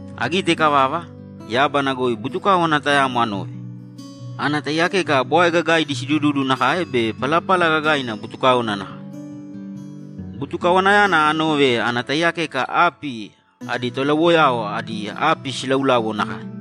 Agite ikavava, yábana goi butukáwana tayamo anove, ana taiyakeka bwae gagaidi sidududu nakae be palapala gagaina butukáona nakae. Butukawanayana anove ana taiyakeka api adi tolauwoyao idi api silauláuwo nakae.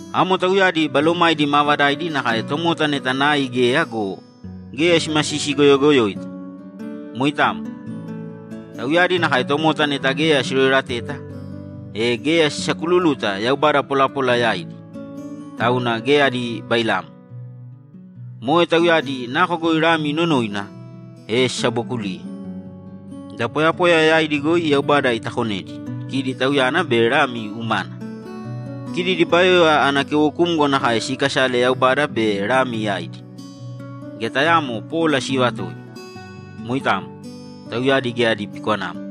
Amo tauyadi balomaidi maavadaidi nakae tomota neta nai geya go, geya simasisigoyogoyoita. Moitamo. Tauyadi nakae tomota neta geya siroerateta, e geya sisakululuta yaubada polapola yaidi, tauna geya adi bailamo. Moe tauyadi nako goi Lami inonoina, e sisabookuliye. Da poyapoya yaidi goi Yaubada itakonedi, kidi Tauyana be Lami umana. Kidi dibayoya ana keuwokumgo nakae siikasale Yaubada be Lami yaidi. Geya tayaamo pola siivatoi. Moitamo. Tauyadi geya adi pikwanamo.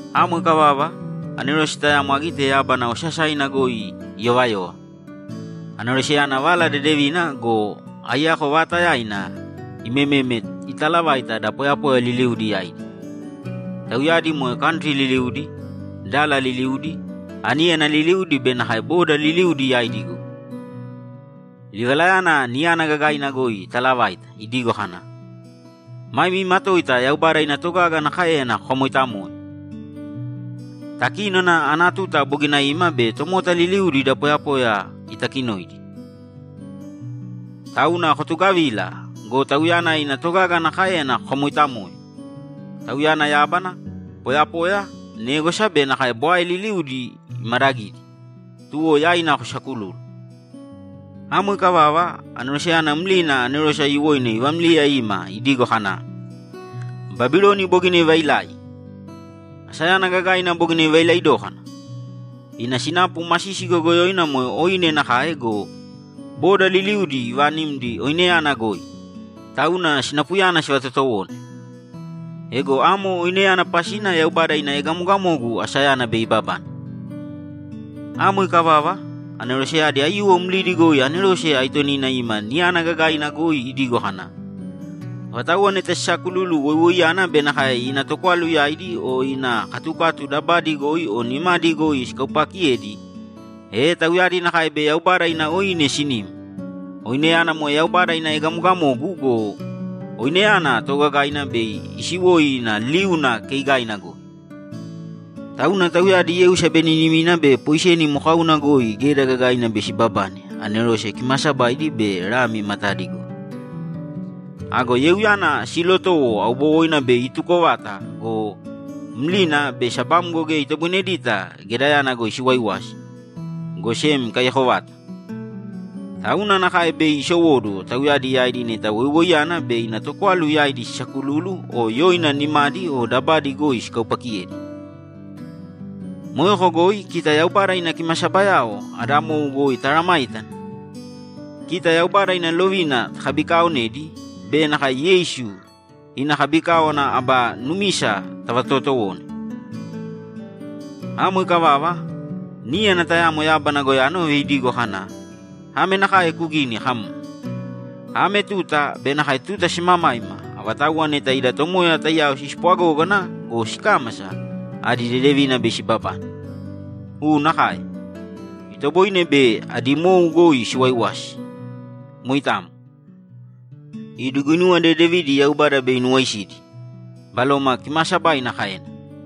Amo ikavava, anerose tayamo agite yábana osasaina goi iyovayova. Aneroseyana Vala Dedevina go, aiyako vaatayaina imememe italavaite da poyapoya liliudi yaidi. Tauyadi moe kantri liliudi, dala liliudi, aníyana liliudi be nakae boda liliudi yaidi goi. Livalayana niyana gagaina goi itaalavaite idigo kana, ‘Mami matoita Yaubada ina togaga ana káeyana kokamoitamōe! Takínona ana tuta bogina ima be tomota liliudi da poyapoya itakinoidi. Tauna kotugavīla go, Tauyana ina togaga ana káeyana kokamoitamōe! Tauyana yábana, poyapoya, négwasa be nakae bwae liliudi imadagidi, tuwo yaina kosakulūlu!’ Amo ikavava, aneroseyana mlina anerose aiyuwoina ivámliya ima idigo kana, ‘Babiloni bogina ivailai! Asayana gagaina bogina ivailai dókana! Ina sinapu masisi goyogoyoina moe oine nakae go, bodao liliudi ivaanimdi oineyana goi, tauna sinapuyana sivatotowone. Ego amo oineyana pasina Yaubada ina egamogamogu asayana bei ibabane.’ Amo ikavava, aneroseyadi aiyuwo mlidi goi anerose aitonina ima niyana gagaina goi idigo kana, ‘Avatauwa neta sisaakululu woiwoiyana be nakae ina tokwalu yaidi o ina katukatu dabadi goi o nimadi goi sikaupaakiyedi, e tauyadi nakae bei Yaubada ina oine sinim. Oineyana moe Yaubada ina egamogamogu go, oineyana toogagaina bei isiwoi ina liuna keigaina goi. Tauna tauyadi yeu sabeninimina be poiseni mokauna goi geda gagaina bei sibabane anerose kimaasabaidi be Lami matadi goi. Ago yeuyana siilotowo aubowoina bei ituko vata go, maliyalina be sabamgo geya itoboinedita gedayana goi siwaiwasi, go sem ikaiyako vata. Tauna nakae bei isowóduwo tauyadi yaidi neta woiwoiyana be ina tokwalu yaidi sisaakululu o yoina nimadi o dabadi goi sikaupaakiyedi.’ Moeko goi kita Yaubada ina kimasabayao ada mou goi taaramāitana, kita Yaubada ina lovina takabikaaonedi be nakae Yeisu ina kabikáwana aba numisa tavatootowone. Amo ikavava, níyana tayamo yábana goi anove idigo kana, ‘Ame nakae kugīni kam, “Ame tuta be nakae tuta simamaima avatauwa neta ida Tomoya taiyao sispwagógana go, sikámasa, adi dedevina bei sibabane.”’ ‘U nakae! Itoboine bei adi mou goi siwaiwasi. Moitamo. Idi guinuwa dedevidi Yaubada bei inuwaisidi’, Baloma Kimaasabaina kaena.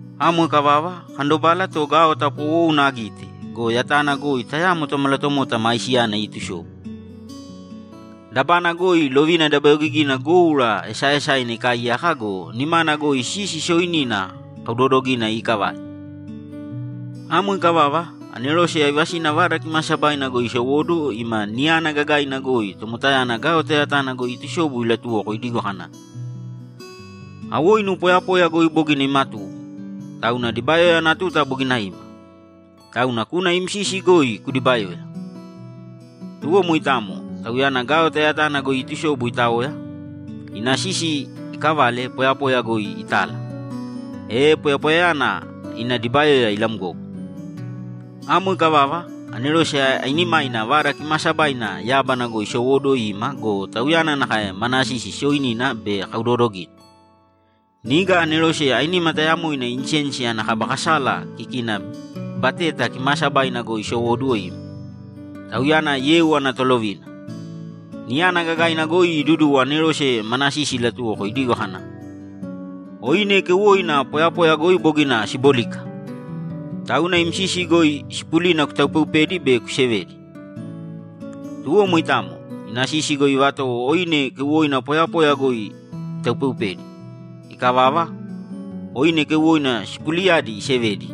Amo ikavava, akandobala to gaota poowouna agite go, yatana goi tayamo tomalatomota maisiyana iitusobu. Dabana goi lovina dabayogigina goura esaaesaina ikaaiyaka go, nimana goi sisi sooinina kaudoodogaina iikavale. Amo ikavava, anerose aivasina Vada Kimaasabaina goi isowóduwo ima niyana gagaina goi tomotayana gaota yatana goi iitusobu ilatuwoko idigo kana, ‘Awoinu poyapoya goi bogina imatuwo, tauna dibayoya ana tuta bogina ima. Tauna kūna im sisi goi kudibayōya.’ Tuwo moitamo, Tauyana gaota yatana goi iitusobu itaoya, ina sisi iikavale poyapoya goi itala, e poyapoyayana ina dibayoya ilamgogo. Amo ikavava, anerose ainimaina Vada Kimaasabaina yábana goi isowóduwo ima go, tauyana nakae mana sisi sooinina be kaudoodogaina. Niga anerose ainima tayamoina insensi ana kaba kasala kikina Bateta Kimaasabaina goi isowóduwo ima. Tauyana yeu ana tolovina. Niyana gagaina goi iduduwo anerose mana sisi ilatuwoko idigo kana, ‘Oine keuwoina poyapoya goi bogina sibólika. Tauna im sisi goi sipulina kutaupeupēdi be kusevēdi.’ Tuwo moitamo, ina sisi goi ivatowo oine keuwoina poyapoya goi itaupeupedi. Ikavava, oine keuwoina sipulidiyadi isevedi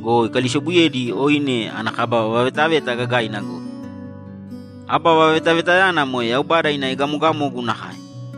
go, ikalisobuyedi oine ana kaba vavetaveta gagaina goi. Aba vavetavetayana moe Yaubada ina egamogamogu nakae.